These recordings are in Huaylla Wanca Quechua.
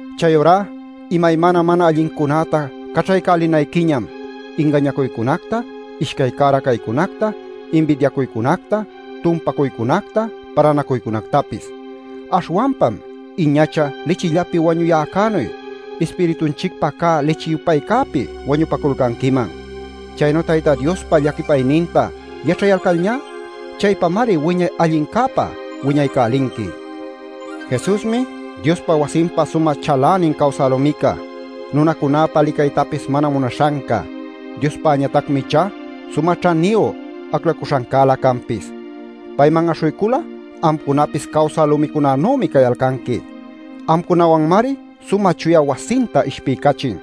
Chayurá imaymana mana allincunäta caćhaycälinayquiñam: ingañacuycunacta, ishcay cära caycunacta, inbidiacuycunacta, tumpacuycunacta, palanacuycunactapis. Aśhwanpam iñacha lichillapi wañuyäcänuy ispiritunchicpä cä lichi-yupaycäpi wañupaculcanquiman. Chaynu Tayta Diospa llaquipayninta yaćhayalcalñá chaypamari wiñay allincäpa wiñaycälinqui. Jesusmi Diospa wasinpa sumä chalänin cawsä lumica, nunacunäpa licaytapis mana munaśhanca; Diospäñatacmi ichá sumä ćhaniyu aclacuśhancälä canpis. Payman aśhuycul'a amcunapis cawsä lumicunanümi cayalcanqui; amcunawanmari sumä chuya wasinta ishpiycachin.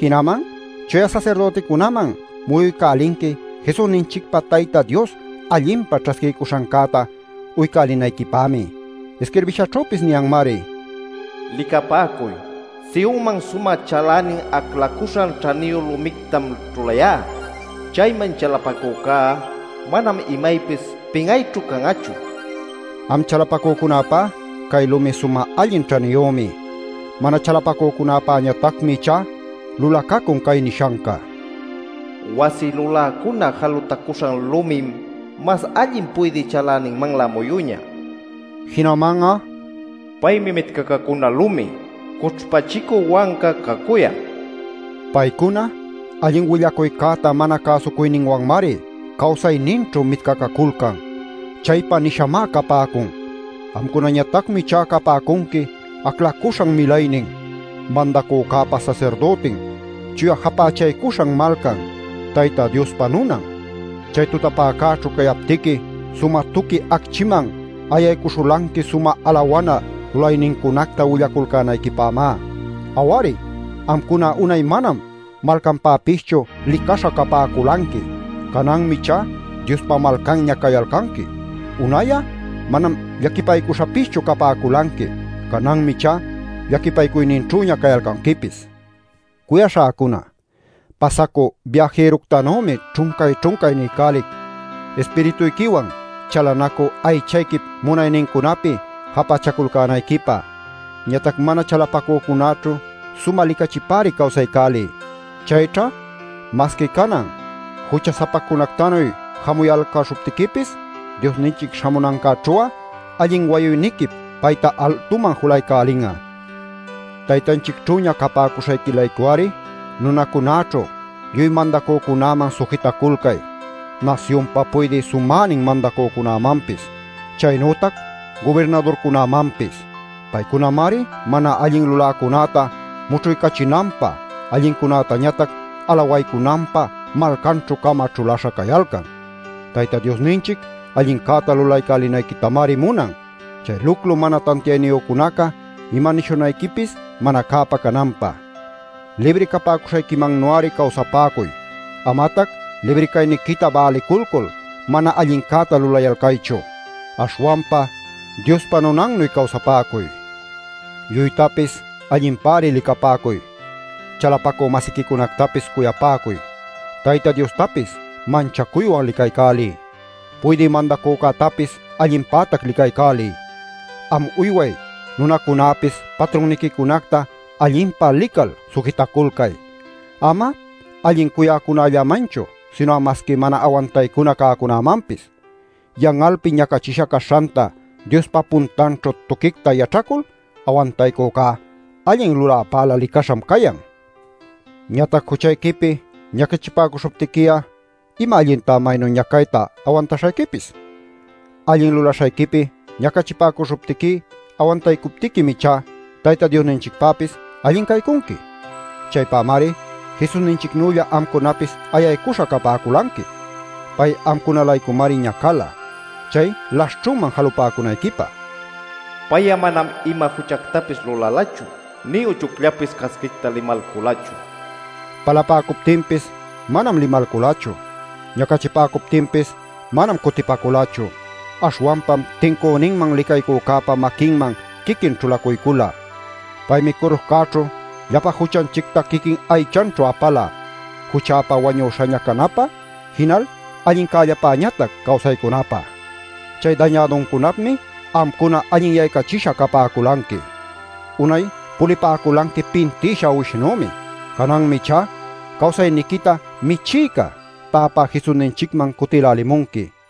Jinaman chuya sasirdüticunaman muyuycälinqui Jesusninchicpa Tayta Dios allinpa ćhasquiycuśhancäta uycälinayquipämi. Isquirbishaćhüpis niyanmari: “Licapäcuy, Sionman sumä chalänin aclacuśhan ćhaniyu lumictam ćhulayá. Chayman chalapacücá manam imaypis pin'ayćhu can'achu” nil. Am chalapacücunäpá cay lumi sumä allin ćhaniyümi. Mana chalapacücunapäñatacmi ichá lulacacun cay nishanca: “Wasi luläcuna jalutacuśhan lumim mas allin puydï chaläninmanlä muyüñä” nil. Jinaman'a: “Paymi mitcacacuna lumi, cućhpachicü wanca cacuyan” Paycuna allin willacuycäta mana cäsucuyninwanmari cawsayninćhu mitcacaculcan. ¡Chaypä nishamá capäcun! Amcunañatacmi ichá capäcunqui aclacuśhan milaynin, Mandacücäpa sasirdütin, chuya japächaycuśhan malcan, Tayta Diospa nunan. Chay tutapäcäćhu cayaptiqui sumä tuqui acchiman ayaycuśhulanqui sumä alawana lulaynincunacta willaculcänayquipämá. Aw-ari, amcuna unay manam malcanpäpischu licaśha capäculanqui; cananmi ichá Diospa malcanña cayalcanqui. Unay'a manam llaquipaycuśhapischu capäculanqui; cananmi ichá llaquipaycuyninćhüña cayalcanquipis. Cuyaśhäcuna, pasacü biajiructanümi ćhuncay-ćhuncay niycälic, ispirituyquiwan chalanacü aychayquip munaynincunapi japächaculcänayquipä. Ñatac mana chalapacücunäćhu sumä licachipäri cawsaycäliy. Chayćha masqui canan jucha-sapacunactanuy jamuyalcäśhuptiquipis Diosninchic śhamunancäćhu'a allin wayuyniquip payta altuman julaycälin'a. Taytanchicćhüña capäcuśhayqui-laycu-ari nunacunäćhu lluy mandacücunäman sujitaculcay: nasyunpa puydï sumänin mandacücämanpis, chaynütac gubirnadurcunämanpis. Paycunamari mana allin luläcunäta mućhuycachinanpä, allincunätañatac alawaycunanpä malcaćhü-cama ćhuläśha cayalcan. Tayta Diosninchic allincäta lulaycälinayquitamari munan, chay luclu mana tantiayniyücunaca ima nishunayquipis mana cäpä cananpä. Libri capäcuśhayquimannu-ari cawsapäcuy; amatac libri cayniquita bäliculcul mana allincäta lulayalcaychu. Aśhwanpa Diospa nunannuy cawsapäcuy. Lluytapis allinpäri licapäcuy: chalapacü-masiquicunactapis cuyapäcuy, Tayta Diostapis manchacuywan licaycäliy, puydï mandacücätapis allinpätac licaycäliy. Am uyway nunacunäpis patrunniquicunacta allinpa lical sujitaculcay, ama allin cuyacücunällamanchu, sinu'a masqui mana awantaycuna cäcunämanpis. Yan'alpi ñacachisha caśhanta Diospa puntanćhu tuquicta yaćhacul awantaycücá allin luläpälä licaśham cayan. Ñatac juchayquipi ñacachipäcuśhuptiqui'a, ¿ima allintá maynu ñacayta awantaśhayquipis? Allin lulaśhayquipi ñacachipäcuśhuptiqui awantaycuptiquim ichá Tayta Diosninchicpäpis allin caycunqui. Chaypämari Jesusninchicnülla amcunapis ayaycuśha capäculanqui. Pay amcuna-laycumari ñacala, chay laśhćhunman jalupäcunayquipä. “Pay'a manam ima juchactapis lulalachu nï uchuyllapis casquicta limalculachu.” Palapäcuptinpis manam limalculachu; ñacachipäcuptinpis manam cutipaculachu, aśhwanpam tincüninman licaycücäpa maquinman quiquin ćhulacuycula. Paymi curuśhcäćhu llapa juchanchicta quiquin aychanćhu apala, juchäpa wañuśhaña canapä jinal allincällapäñatac cawsaycunapä. ¡Chay dañäduncunapmi amcuna allinyaycachisha capäculanqui! Unay pulipäculanqui pintïsha uwishnümi. Cananmi ichá cawsayniquita Michïca, Täpä Jesusninchicman cutïlälimunqui.